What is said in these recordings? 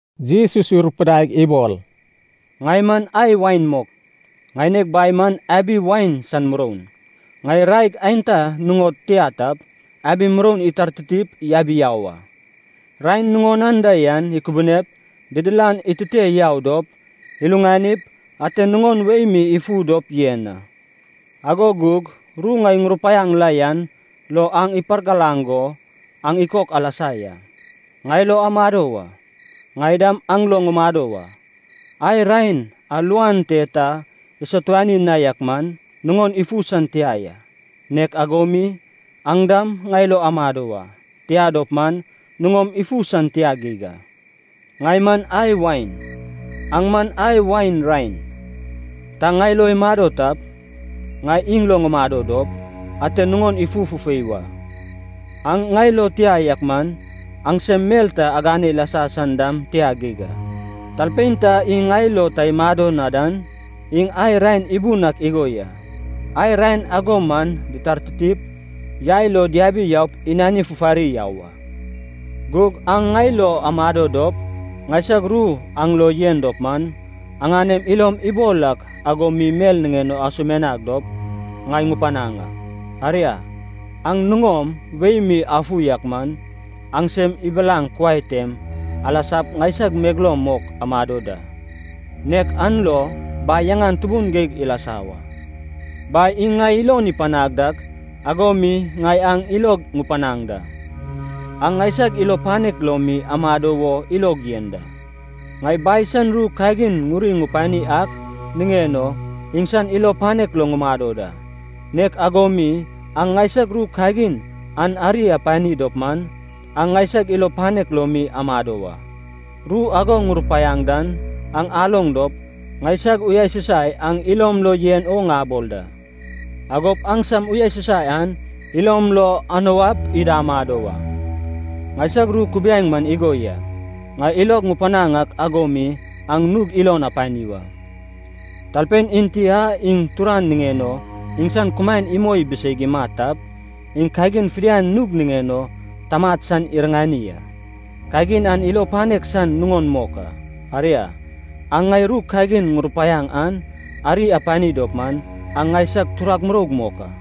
Jesus irupudaig ibol, “Ŋai man ai wain mok. Ŋaineg Bai man abi wain san muroun. Ŋai raeg aenta nuŋod tia tap, abi muroun itartitip yabi yau a. Raen nuŋon anda yan ikubunep, didilan itute yau dop, iluŋanip, ate nuŋon wei mi ifu dop yen a. Ago gug ru ŋai ŋurupaiaŋ la yan lo aŋ ipargalaŋ go aŋ ikok alasa ya. Ŋai lo amado wa. Ŋai dam aŋ lo ŋumado wa. Ai raen a luan te ta isatuani na yak man, nuŋon ifu san tia ya. Nek ago mi, aŋ dam ŋai lo amado wa, tia dop man, nuŋom ifu san tia geig a. “Ŋai man ai wain. Aŋ man ai wain raen. Ta ŋai lo imado tap, ŋai iŋ lo ŋumado dop, ate nuŋon ifu fufei wa. Aŋ ŋai lo tia yak man, aŋsem mel ta agane ilasa san dam tia geig a. Talpein ta iŋ ŋai lo ta imado na dan, iŋ ai raen ibun ak igo ya. Ai raen ago man ditartitip, yai lo diabi yaup inani fufari yau a. Gug aŋ ŋai lo amado dop, ŋaisag ru aŋ lo yen dop man, aŋanem ilom ibol ak ago mi mel niŋen o asumianag dop, ŋai ŋupanaŋ a. Aria, aŋ nuŋom wei mi afu yak man, aŋsem ibilaŋ kuai tem alasag ŋaisag megeloum mok amado da, nek an lo Bai yaŋan tubun geig ilasa wa. “Bai iŋ ŋai ilon ipanag dak, ago mi ŋai aŋ ilog ŋupanaŋ da. Aŋ ŋaisag ilo panek lo mi amado wo ilog yen da. Ŋai Bai san ru kagin ŋuri ŋupani ak niŋen o, iŋsan ilo panek lo ŋumado da. Nek ago mi aŋ ŋaisag ru kagin an ari apani dop man, aŋ ŋaisag ilo panek lo mi amado wa. Ru ago ŋurupaiaŋ dan aŋ aloŋ dop, ŋaisag uyasusai aŋ ilom lo yen o ŋabol da. Agop aŋsam uyasusai an ilom lo anuap ida amado wa. Ŋaisag ru kubiaeŋ man igo ya, ŋai ilog ŋupanaŋ ak ago mi aŋ nug ilon apani wa. Talpein enti a iŋ turan niŋen o iŋsan kumaen imoi ibiseig imat tap, iŋ kagin fidian nug niŋen o tamat san iriŋani a. Kagin an ilo panek san nuŋon mok a. Aria, aŋ ŋai ru kagin ŋurupaiaŋ an ari apani dop man, aŋ ŋaisag turag muroug mok a.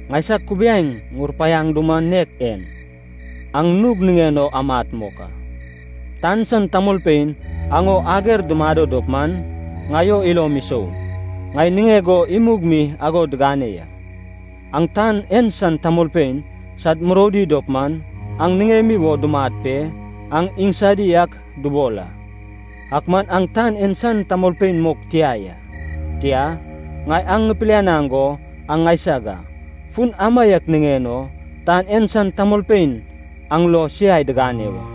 Ŋaisag kubiaeŋ ŋurupaiaŋ duman nek en, aŋ nug niŋen o amat mok a. “Tan san tamolpein aŋ o ager dumado dop man, ŋai o ilom isou. Ŋai niŋeg o imug mi ago digane ya. Aŋ tan en san tamolpein sad muroudi dop man, aŋ niŋemi wo dumat pe, aŋ iŋsadi ak dubol a. Ak man aŋ tan en san tamolpein mok tia ya, tia, ŋai aŋ ŋipilianaŋ go aŋ ŋaisag a. Fun amaiak niŋen o tan en san tamolpein aŋ lo siai digane wa.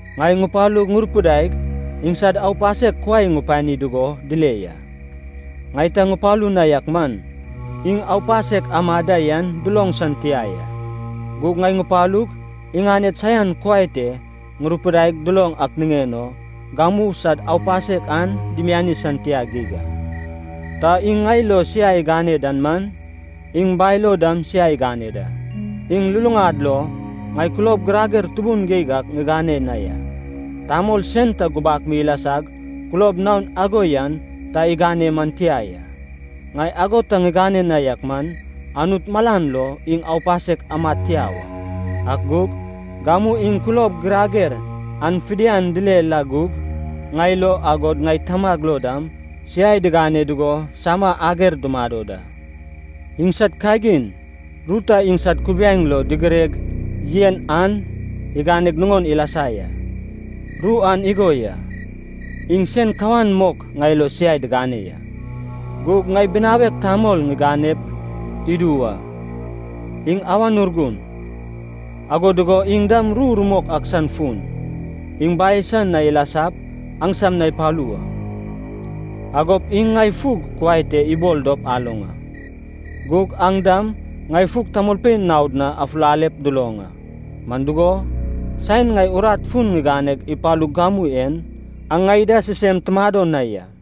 Ŋai ŋupalug, ŋurupidaig, iŋsad aupasek kuai ŋupani dugo dile ya. Ŋai ta ŋupalu na yak man, iŋ aupasek amad da yan duloŋ san tia ya. Gug ŋai ŋupalug, iŋaned saian kuai te ŋurupidaig duloŋ ak niŋen o, gamu sad aupasek an dimiani san tia geig a. Ta iŋ ŋai lo siai igane dan man, iŋ Bai lo dam siai igane da. Iŋ luluŋad lo ŋai kulob girager tubun geig ak ŋigane na ya. Tamol sen ta gubak mi ilasag kulob naok ago yan ta igane man tia ya. Ŋai ago ta ŋigane na yak man, Anut malan lo iŋ aupasek amad tia wa. Ak gug, gamu iŋ kulob girager an fidian dile la gug, ŋai lo, agod ŋai Tamag lo dam, siai digane dugo sama ager dumado da. Iŋsad kagin, ru ta iŋsad kubiaeŋ lo digireg yen an iganeg nuŋon ilasa ya. Ru an igo ya, ‘Iŋ sen kawan mok ŋai lo siai digane ya.’ “Gug ŋai Binawek Tamol ŋiganep idu wa. Iŋ Awan Urgun, ago dugo iŋ dam ru rumok ak san fun. Iŋ Bai san na ilasap, aŋsam na ipalu wa. Agop iŋ ŋai fug kuai te ibol dop aloŋ a. Gug aŋ dam ŋai fug tamolpein naod na afulalep duloŋ a. Man dugo, saen ŋai urat fun ŋiganeg ipalug gamu en, aŋ ŋai da sisem tumado na ya.